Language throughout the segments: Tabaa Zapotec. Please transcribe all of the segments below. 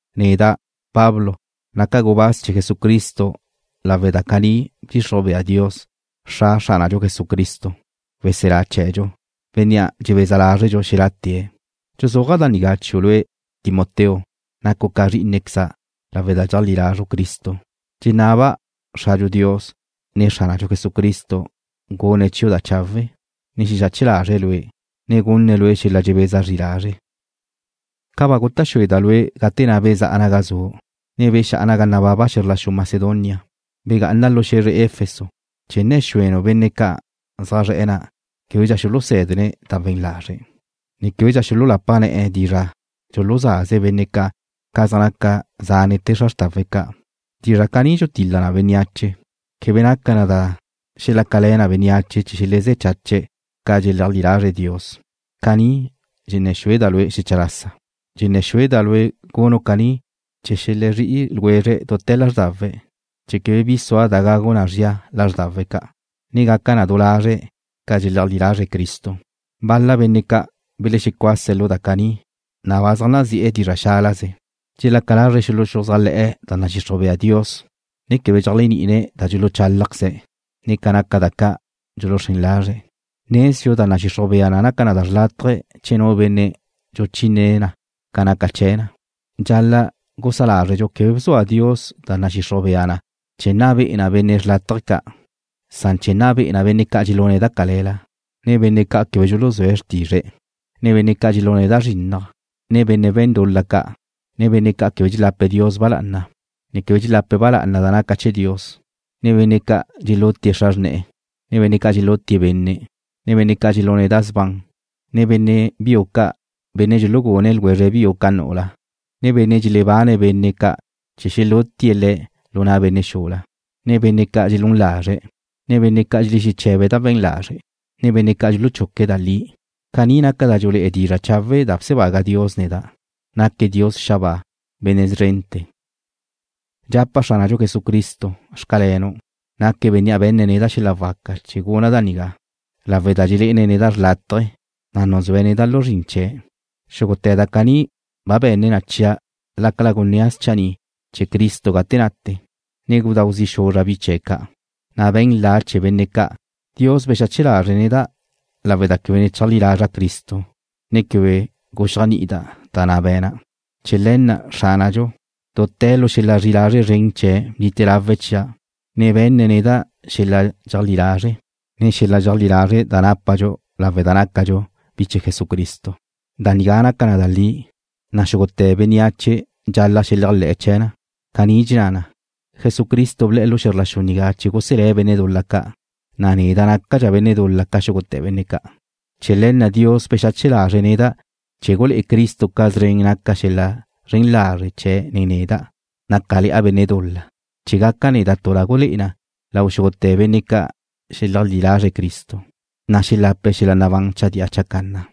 Neda', Pablo, naca' gubáz chee̱ Jesucristo lawe' da caní bdxixruj bea Dios, Xra Xránadxu Jesucristo, weselá chee̱dxu, Bénnea' dxebeza lázredxu xelá'tee̱'. Dxuzúaja' da nigá chiu' lue', Timoteo, nacu' ca zrí'inequeza' lawe' da dxeajlí lazru' Cristo. Dxenaba' Xradxu Dios, ne Xránadxu Jesucristo gune̱' chiu' da chawe', ne xexache lazre̱' lue', ne gunne̱' lue' xel-la dxebeza zri lazre'. Ca ba guta' xúeda' lue' gate na' bezá'a naga zu', ne bexá'a naga nababa xe̱zr la xu Macedonia, begá'ana lu xe̱zre Efeso chee̱ nne̱ xúenu' benne' ca' zaj zre̱'e̱ na' québedxa xulusé̱dene̱' da we̱n lazre', ne québedxa xululapa ne̱'e̱ dizra' dxuluzaze benne' ca' ca zaj naca zánete̱ xra xrtawe̱' ca'. Dizra' caní dxulutil-la na bénneache. Quebe naca na da xelácale̱ na bénneache chee̱ xelezé̱ chache̱' ca dxeleajlí lazre̱' Dios. Caní dxenné̱ xúeda' lue' xecha lasa. Dxenné̱ xúeda' lue' gunu' caní chee̱ xelezrí'i ljwezre̱' dute̱ lázrdawe̱', chee̱ quebe bi sua da gagu na zria lázrdawe̱' ca', ne gaca du lazre' ca dxeleajlí lazre̱' Cristo. Bal-la benne' ca' belexecuase̱' lu da caní, na' ba zaj nazi'e̱ dizra' xálaze. Dxelaca lazre̱' xuluxuzájle̱'e̱ da nadxixruj bea Dios, ne quebe dxeléajni'ine̱' da dxuluchálajqueze̱', ne ca naca da ca' dxuluxrén lazre̱'. Nezdxu da nadxixruj bea na naca na xrlátaje che nu benne' dxuchínene̱' na ca naca chee̱ na. Dxal-la' gusá lázredxu quebe bzua Dios da nadxixruj bea na chee̱ nna be'e na benne' xrlátaje ca', san chee̱ nna be'e na benne' ca' dxelune̱' da cale̱la, ne benne' ca' quebe dxuluzúe̱' xrtizre̱'e̱, ne benne' ca' dxelune̱' da zrinnaj, ne benne' we̱n dul-la ca', ne benne' ca' quebe dxelape̱' Dios ba lá'ana, ne quebe dxelapa ba lá'ana da naca chee̱ Dios, ne benne' ca' dxelute xra xrna', ne benne' ca' dxelutie̱' benne', ne benne' ca' dxelune̱' da sban, ne benne' biu ca', benne' dxulugune̱' ljwezre biue̱' ca nu'ula, ne benne' dxelebane̱' benne' ca' chee̱ xelutie̱' le̱' lu na' benne' xula, ne benne' ca' dxelún lazre̱', ne benne' ca' dxelexeche̱be̱' da we̱n lazre', ne benne' ca' dxuluchuque̱' da li. Caní naca da dxulé'e dizra' chawe' da bsebaga Dios neda'. Naque̱' Dios xabáa, Benne' szrente̱. Dxapa' Xránadxu Jesucristo: Xcalenu'. Naque̱' Bénnea' be̱nne̱' neda' xel-la waca chee̱ guna' da nigá, lawe' da dxelé'ene̱' neda' xlátaje̱, na' nuzúe̱' neda' lu zrin chee̱'. Xúgute̱ da caní ba be̱ne̱' chia' lácala gunnía' schanni' chee̱ Cristo gate nate, ne gudáu zi' xuzra' bi chee̱' ca', ne be̱n la' chee̱ benne' ca'. Dios bexache lazre̱' neda' lawe' da quebe ne cheajlí lazra' Cristo, ne quebe guxéajni'ida' da na' be̱na'. Chee̱ le̱ na' Xránadxu, dute̱ lu xel-la zri'i lazre' zren chee̱' bnite lawe̱' chia', ne be̱nne̱' neda' xel-la dxeajlí lazre', ne xel-la zri'i lazre' da nápadxu lawe' da nácadxu bi chee̱ Jesucristo. Da nigá naca na da li, na' xúgute̱ bénneache dxal-la' xeléajle̱'e̱ chee̱ na. Caní dxenná na: Jesucristo ble̱'e̱ lu xe̱zr la xu nigá chee̱ guselé̱' benne' dul-la ca', na' neda' nácadxa' benne' dul-la ca xúgute̱ benne' ca'. Chee̱ le̱ na' Dios bexache lazre̱' neda' chee̱ gulé'e Cristo ca szren naca xel-la zren lazre' chee̱' nen neda', nácale̱'a benne' dul-la, chee̱ gaca' neda' tu da gulé'e na lau xúgute̱ benne' ca' xeleajlí lazre̱' Cristo, na' xelape̱' xel-la nabán chadía chacanna.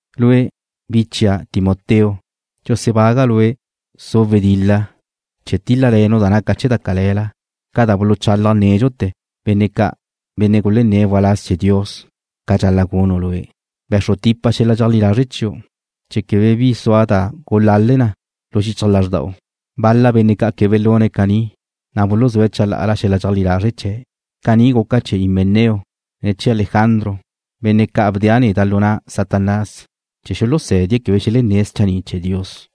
Lue', bi chia', Timoteo, dxusebaga' lue' su' wedil-la chee̱ tíl-lale̱nu' da naca chee̱ da cale̱la, ca da buluchalaj nédxute̱ benne' ca', benne' gulenné̱' waláz chee̱ Dios ca dxal-la' gunu' lue'. Be̱xru tipa xel-la dxeajlí lazre' chiu', chee̱ quebe bi sua da gulale na lu xichaj lazrda'u. Bal-la benne' ca' quebe belune̱' caní, na' buluzúe̱' chalá'ala xel-la dxeajlí lazre' chee̱'. Caní guca chee̱ Himeneo, ne chee̱ Alejandro, benne' ca' bdea' neda' lu na' Satanás chee̱ xulusé̱die̱' quebe xelenné̱' schanni' chee̱ Dios.